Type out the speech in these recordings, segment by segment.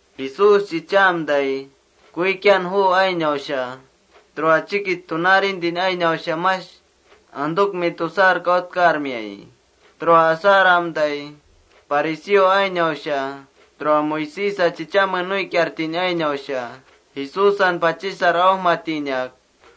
Jesús chichaamtai, kuikian juu ainausha tura chikich tunaarintin ainausha mash antukmi tusar kautkarmiayi. Tura asaramtai fariseo ainausha, tura Moisésa chichame nuikiartin ainausha Jesúsan pachisar aujmatinak: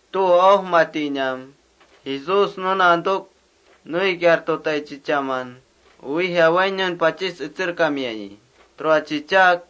Tu aujmatinam Jesús nuna antuk nuikiartutai chichaman uwija wainiun pachis etserkamiayi. Tura etserak: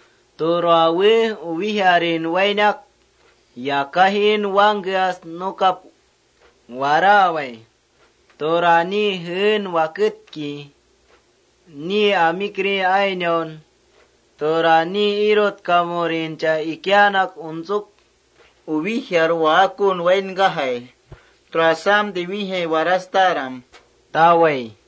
Tura we uwijarin wainak, yakajin wangkeas nukap waraawai. Tura ni jeen waketki, ni amikri ainaun, tura ni irutkamurincha ikiaanak untsuk: ‘Uwijar mengkakaun wainkajai. Tura asamtai wijai warastaram,’ tawai.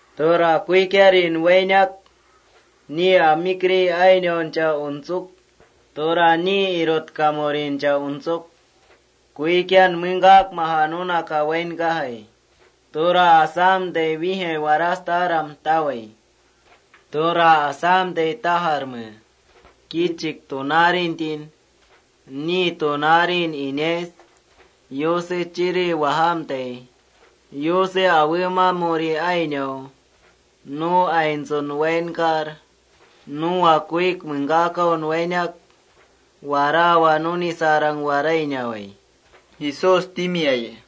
Tura kuikiarin wainak ni amikri ainauncha untsuk, tura ni irutkamurincha untsuk: ‘Kuikian mengkakmaja nunaka wainkajai. Tura asamtai wijai warastaram,’ tawai. Tura asamtai tajarme: Kichik tunaarintin ni nintimaurin yapajia Yusen tsangkutrurta tamatikia, Yuse awemamuri ainau nu aintsun wainkar, nuwa kuik mengkakaun wainak waraawa nunisarang warainawai,” Jesús timiayi.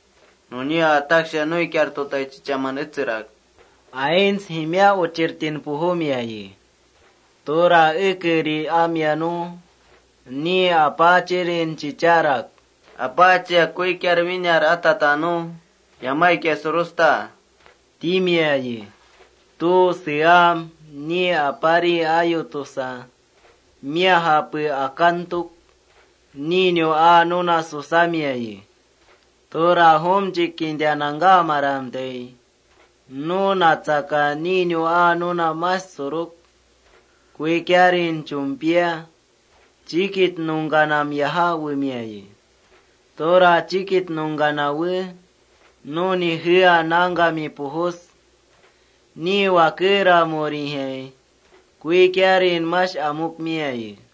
Nunia Jesús ataksha nuikiartutai chichaman etserak: “Aints jimia uchirtin pujumiayi. Tura ekeri amia nu ni aparin chicharak: ‘Apaachia, ame jakaakmin kuikiar winar atata nu yamaik surusta,’ timiayi. Tu seam ni apari: Ayu tusa, japen akantuk ninu aa nuna susamiayi. Tura jumchik kinta nangkamaramtai, nu natsaka ninu aa nuna mash suruk, kuikiarin chumpia chikich nungkanam yajá wemiayi. Tura chikich nungkanam we nuni jea, nangkami pujus ni wakeramurijai kuikiarin mash amukmiayi.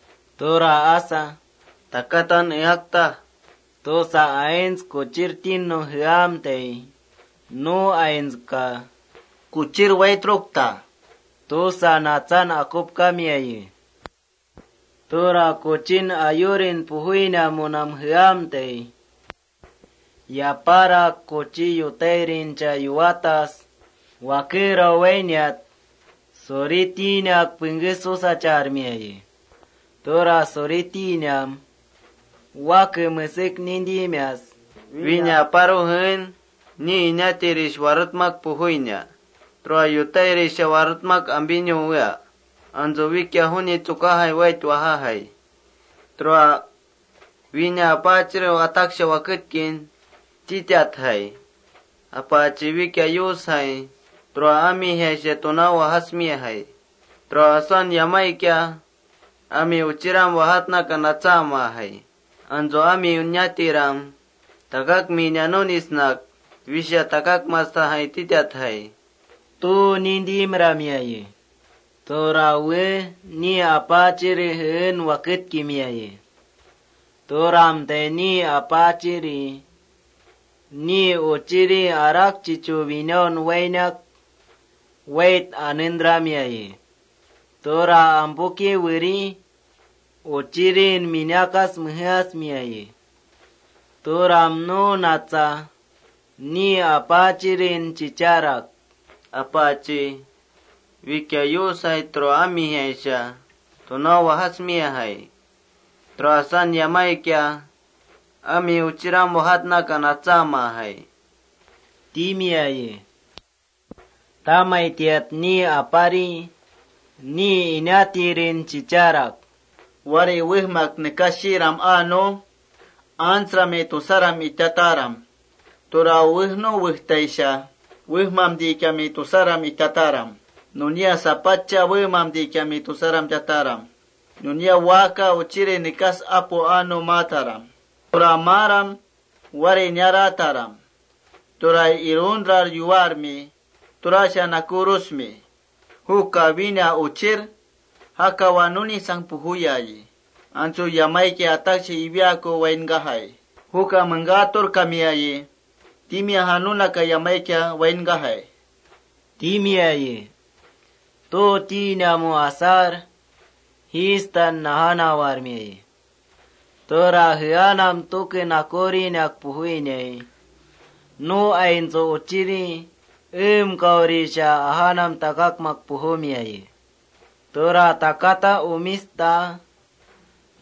Tura asa: Takatan eaktaj tusa, aints kuchirtinnum jeamtai, nu aintska: Kuchir waitrukta tusa natsan akupkamiayi. Tura kuchin yurin pujuinamunam jea, yaparak kuchi yutairincha yuwatas wakerau wainiat suritinak pengké susacharmiayi. Tura suritinam wake mesek nintimias: ¿Wina aparu jeen ni inatirisha warutmak pujuina? ¿Tura yutairisha warutmak ampinu wea? Antsu wikia juni tsukajai wait wajajai. Tura wína aparun waketkin titatjai: ‘Apaachi, wikia Yusjai tura amijaisha tunau wajasjai. Tura asan yamaikia ami uchiram wajatnaka natsaamajai. Antsu ami inatiram takakmina nunisnak wisha takakmastajai titatjai, tu nintimramiayi. Nunia ni apari jeen waketkimiayi. “Turamtai ni apari uchirin winaun wainak wait anentramiayi. Tura ampuki weri uchirin minakas mejeasmiayi. Turam nu natsa aparin chicharak: ‘Apaachi, wikia Yusjai tura amijaisha tunau wajasjai. Tura asan yamaikia ami uchiram wajatnaka natsaamajai,’ timiayi. “Tamaitiat apari ni inatirin chicharak: ‘Wári wejmak nekas shiiram aa nu antsrami tusaram itataram. Tura uwejnum wetaisha wemamtikiami tusaram itataram. Nunia sapatcha wemamtikiami tusaram itataram. Nunia waaka uchiri nekas apu aa nu maataram. Tura maaram wári inarataram. Turar iruntrar yuwar nunia nakurusmi. Juka wína uchir jakawa nunisang pujuyayi. Antsu yamaikia ataksha iwiaakun wainkajai. Juka mengkaturkamiayi timiaja nunaka yamaikia wainkajai,’ timiayi. Tu tinamu asar fiestan najanawarmiayi. “Tura jeanam nakurinak pujuinai, nu aintsu uchiri eemkaurisha ajanam takakmak pujumiayi. Tura takatan umis taa,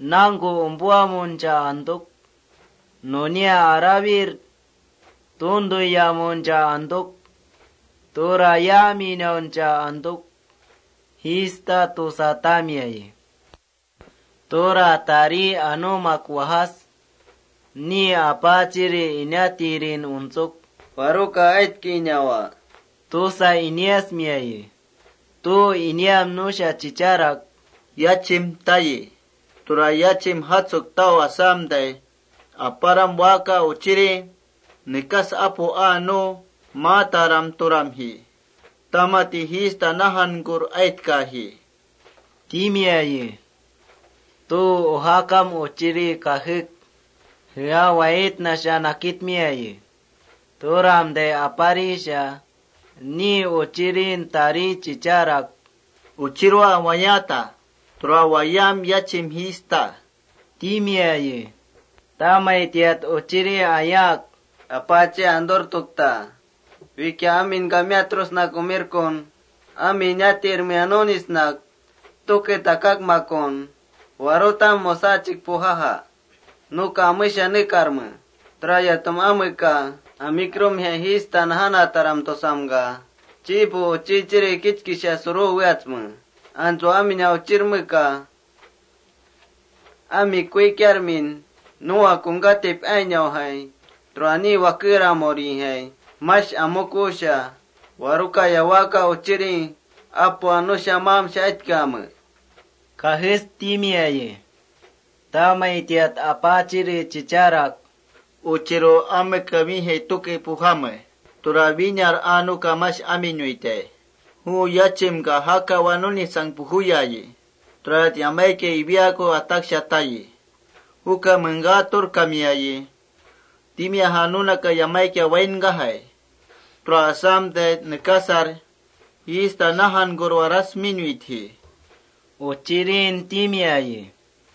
nangku umpuamuncha antuk, nunia arawir tuntuyamuncha antuk, tura yaaminauncha antuk: Jiitaj tusa tarimiayi. Tura tari anumak wajas, ni apari inatirin untsuk: ‘¿Waruka aitkinawa?’ tusa iniasmiayi. Tu iniam nusha chicharak: ‘Yachim tayi. Tura yachim jatsuk tau asamtai, aparam waaka uchiri nekas apu aa nu maataram turamji. Tamati fiesta najankur aitkaji,’ timiayi. Tu ujaam uchiri kajek jea waaitnasha nakitmiayi. Turamtai aparisha ni uchirin weri chicharak: ‘Uchirua wayaata. Tura wayaam yachim jiista,’ timiayi. Tamaitiat uchiri ayaak: ‘Apaachia anturtukta. ¿Wikia aminka miatrusnak umirkun ami inatirmea nunisnak tuke takakmakun warutam musachik pujaja? Nusha amesha nekarme. Turayatum ameka: Amikrumjai fiesta najanataram tusamka, chipu uchiri kichkisha suruweatsme. Antsu aminu uchirmeka ami kuikiarmin nuwa kungkatip ainaujai tura ni wakeramurijai mash amukusha ¿waruka waaka uchiri apu aa nusha maamsha aitkame?’ kajes timiayi. Tamaitiat apari chicharak: ‘Uchiru, ameka wijai tuke pujame. Tura winar aa nuka mash aminuitai. Yachimka jakawa nunisang pujuya nu yamaikia iwiaaku ataksha tayi. Nuka mengkaturkamiayi timiaja nunaka yamaikia wainkajai. Tura asamtai nekasar fiesta najankur warastinuitji,’ uchirin timiayi.”